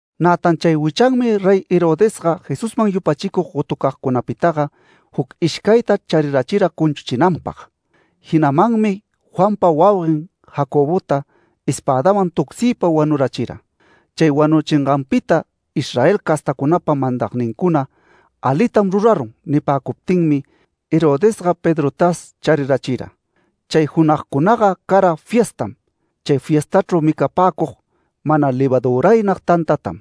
Nätan chay wichanmi Rey Herodesga Jesusman yupachicug gotucagcunapitaga juc ishcayta charirachira cunchuchinanpag. Jinamanmi Juanpa wauguen Jacobota espädawan tucsiypa wanurärichira. Chay wanuchinganpita Israel castacunapa mandagnincuna “Alitam rurarun” nipäcuptinmi, Herodesga Pedrotas charirachira. Chay junagcunaga cara fiestam. Chay fiestachru micapäcug mana levaduraynag tantatam.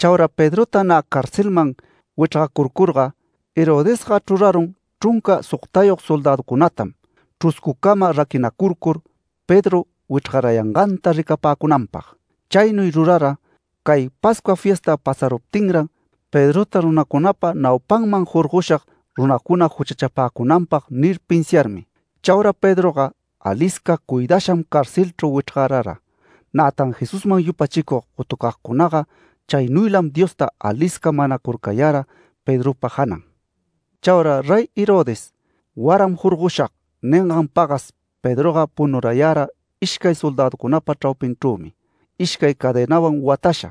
Chaura Pedrota nä carcelman wichrgacurcurga, Herodesga chrurarun chrunca sogtayog soldäducunatam, chruscucama raquinacurcur Pedro wichrgarayanganta ricapäcunanpag. Chaynuy rurara “Cay Pascua fiesta pasaruptinran Pedrota runacunapa naupanman jorgoshag, runacuna juchachapäcunanpag” nir pinsiarmi. Chaura Pedroga alisca cuidasham carcelchru wichrgarara. Nätan Jesusman yupachicug gotucagcunaga chaynuylam Diosta alisca manacurcayara Pedropa janan. Chaura Rey Herodes “Waram jorgoshag” ningan pagas Pedroga punurayara ishcay soldäducunapa chraupinchrümi ishcay cadenawan watasha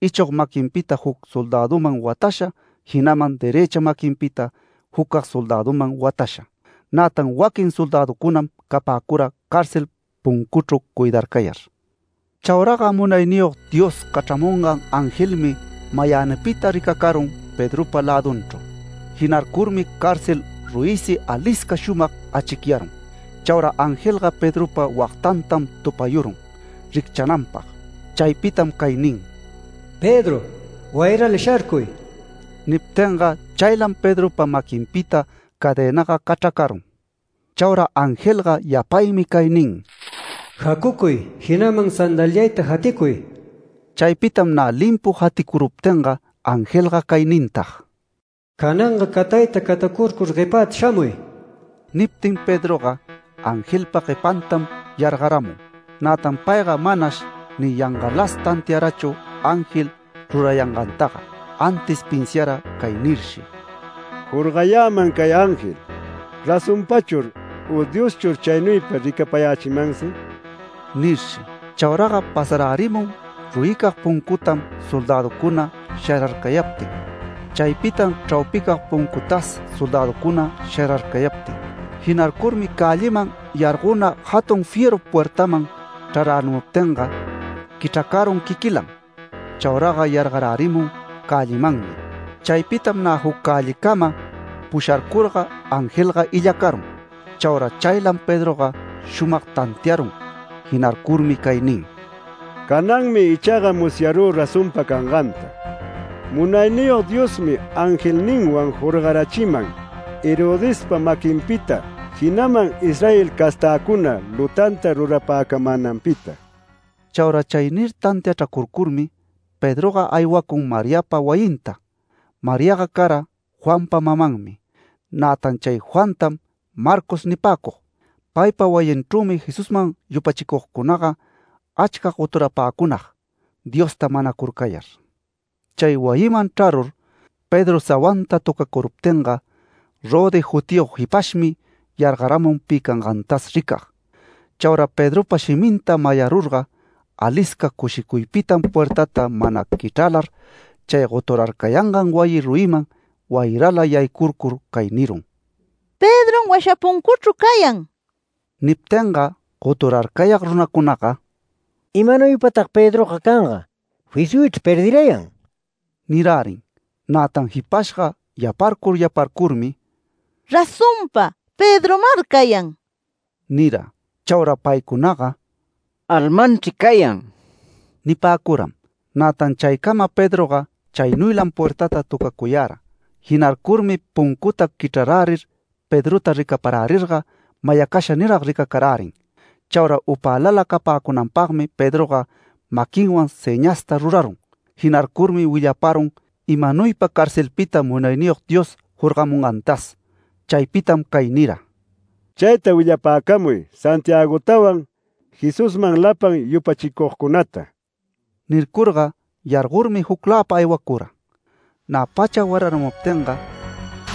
ichog maquinpita juc soldäduman watasha jinaman derëcha maquinpita jucag soldäduman watasha. Nätan waquin soldäducunam capäcura cárcel puncuchru cuidarcayar. Chauraga Munayniyog Dios cachramungan angelmi mayänipita ricacarun Pedropa lädunchru. Jinarcurmi cárcel ruyisi alisca shumag achicyarun. Chaura angelga Pedropa wagtantam tupayurun ricchananpag. Chaypitam cay nin: “Pedro, ¡wayrala sharcuy!” Niptinga chaylam Pedropa maquinpita cadenaga cachracarun. Chaura angelga yapaymi cay nin: “Jacucuy, jinaman sandaliayta jaticuy”. Chaypitam nä limpu jaticuruptinga angelga cay nintag: “Cananga catayta catacurcur guepäta shamuy”. Niptin Pedroga angelpa guepantam yargaramun. Nätan payga manash ni yangalas tantiarachu ángel rurayangantaga, antis pinsiara cay nirshi: “Jorgayäman cay ángel ¿razonpachur u Dioschur chaynuypa ricapayächimansi?” nirshi. Chauraga pasarärimun ruyicag puncutam soldäducuna shararcayaptin. Chaypitam chraupicag puncutas soldäducuna shararcayaptin. Jinarcurmi cälliman yargona jatun fierru puertaman chrarärimuptinga quichracarun quiquilan. Chauraga yargarärimun cällimanmi. Chaypitam nä juc cällicama pusharcurga, angelga illacarun. Chaura chaylam Pedroga shumag tantiarun. Jinarcurmi cay nin: “Cananmi ichaga musyarü razonpa canganta. Munayniyog Diosmi angelninwan jorgarachiman Herodespa maquinpita, jinaman Israel castäcuna lutanta rurapäcamänanpita”. Chaura chay nir tantiachracurcurmi Pedroga aywacun Mariapa wayinta. Mariaga cara Juanpa mamanmi. Nätan chay Juantam, Marcos nipäcug. Paypa wayinchrümi Jesusman yupachicugcunaga achca goturapäcunag Diosta manacurcayar. Chay wayiman chrarur, Pedro sawanta töcacuruptinga Rode jutiyog jipashmi yargaramun pi cangantas ricag. Chaura Pedropa shiminta mayarurga, alisca cushicuypitam puertata mana quichralar chay goturarcayangan wayi ruyiman wayrala yaycurcur cay nirun: “¡Pedrom washa puncuchru cayan!” Niptinga goturarcayag runacunaga “¿Imanuypatag Pedroga canga? Fisyuychri perdirayan” nirärin. Nätan jipashga yaparcur yaparcurmi “Razonpa, Pedromar cayan” nira. Chaura paycunaga “Almanchri cayan” nipäcuram. Nätan chaycama Pedroga chaynuylam puertata tocacuyara. Jinarcurmi puncuta quichrarärir Pedrota ricaparärirga mayacasha nirag ricacarärin. Chaura upälala capäcunanpagmi Pedroga maquinwan sëñasta rurarun. Jinarcurmi willaparun imanuypa carcelpita Munayniyog Dios jorgamungantas. Chaypitam cay nira: “Chayta willapäcamuy Santiagotawan Jesusman lapan yupachicugcunata”. Nircurga yargormi jucläpa aywacura. Nä pacha wararamuptin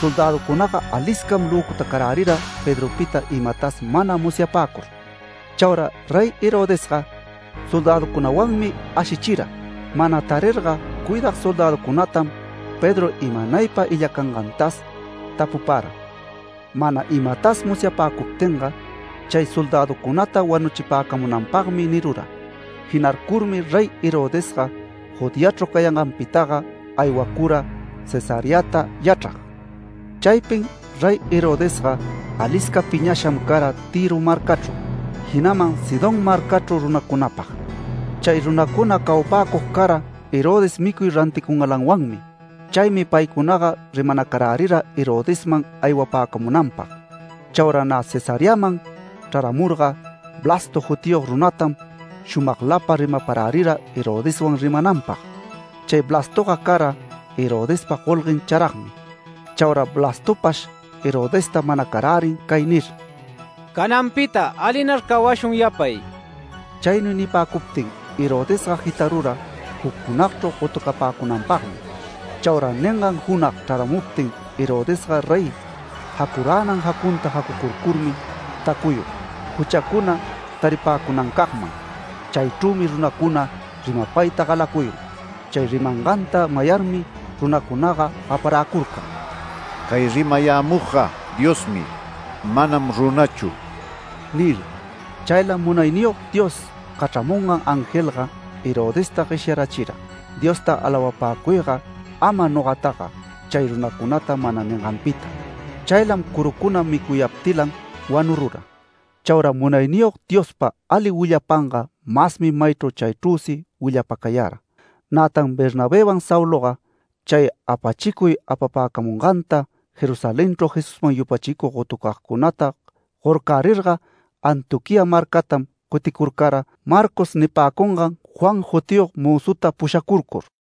soldäducunaga aliscam löcutacarärira Pedropita imatas mana musyapäcur. Chaura Rey Herodesga soldäducunawanmi ashichira. Mana tarirga cuidag soldäducunatam Pedro imanaypa illacangantas tapupara, mana imatas musyapäcuptinga, chay soldäducunata wanuchipäcamunanpagmi nirura. Jinarcurmi Rey Herodesga Judeachru cayanganpitaga aywacura Cesareata yachrag. Chaypin Rey Herodesga alisca piñasham cara Tïro marcachru, jinaman Sidón marcachru runacunapag. Chay runacuna cawapäcug cara Herodes micuy ranticungalanwanmi. Chaymi paycunaga rimanacarärira Herodesman aywapäcamunanpag. Chaura nä Cesareaman chraramurga Blasto jutiyog runatam shumaglapa rimaparärira Herodeswan rimananpag. Chay Blastoga cara Herodespa golguen charagmi. Chauraga Blastopash Herodesta manacarärin cay nir: “Cananpita alinar cawashun yapay”. Chaynuy nipäcuptin Herodesga jitarura juc junagchru gotucapäcunanpagmi. Chaura ningan junag chraramuptin Herodesga rey jacuränan jacunta jacucurcurmi tacuyun, juchacuna taripäcunancagman. Chaychrümi runacuna rimapayta galacuyun. Chay rimanganta mayarmi runacunaga gaparäcurcan: “Cay rimayämugga Diosmi. Manam runachu” nir. Chaylam Munayniyog Dios cachramungan angelga Herodesta gueshyarachira “Diosta alawapäcuyga ama nogataga”, chay runacunata mana ninganpita. Chaylam curucuna micuyaptilan wanurura. Chaura Munayniyog Diospa ali willapanga masmi maychru chaychrüsi willapacayara. Nätan Bernabëwan Sauloga chay apachicuy apapäcamunganta Jerusalenchru Jesusman yupachicug gotucagcunata gorcärirga Antioquía marcatam cuticurcara Marcos nipäcungan Juan jutiyog mözuta pushacurcur.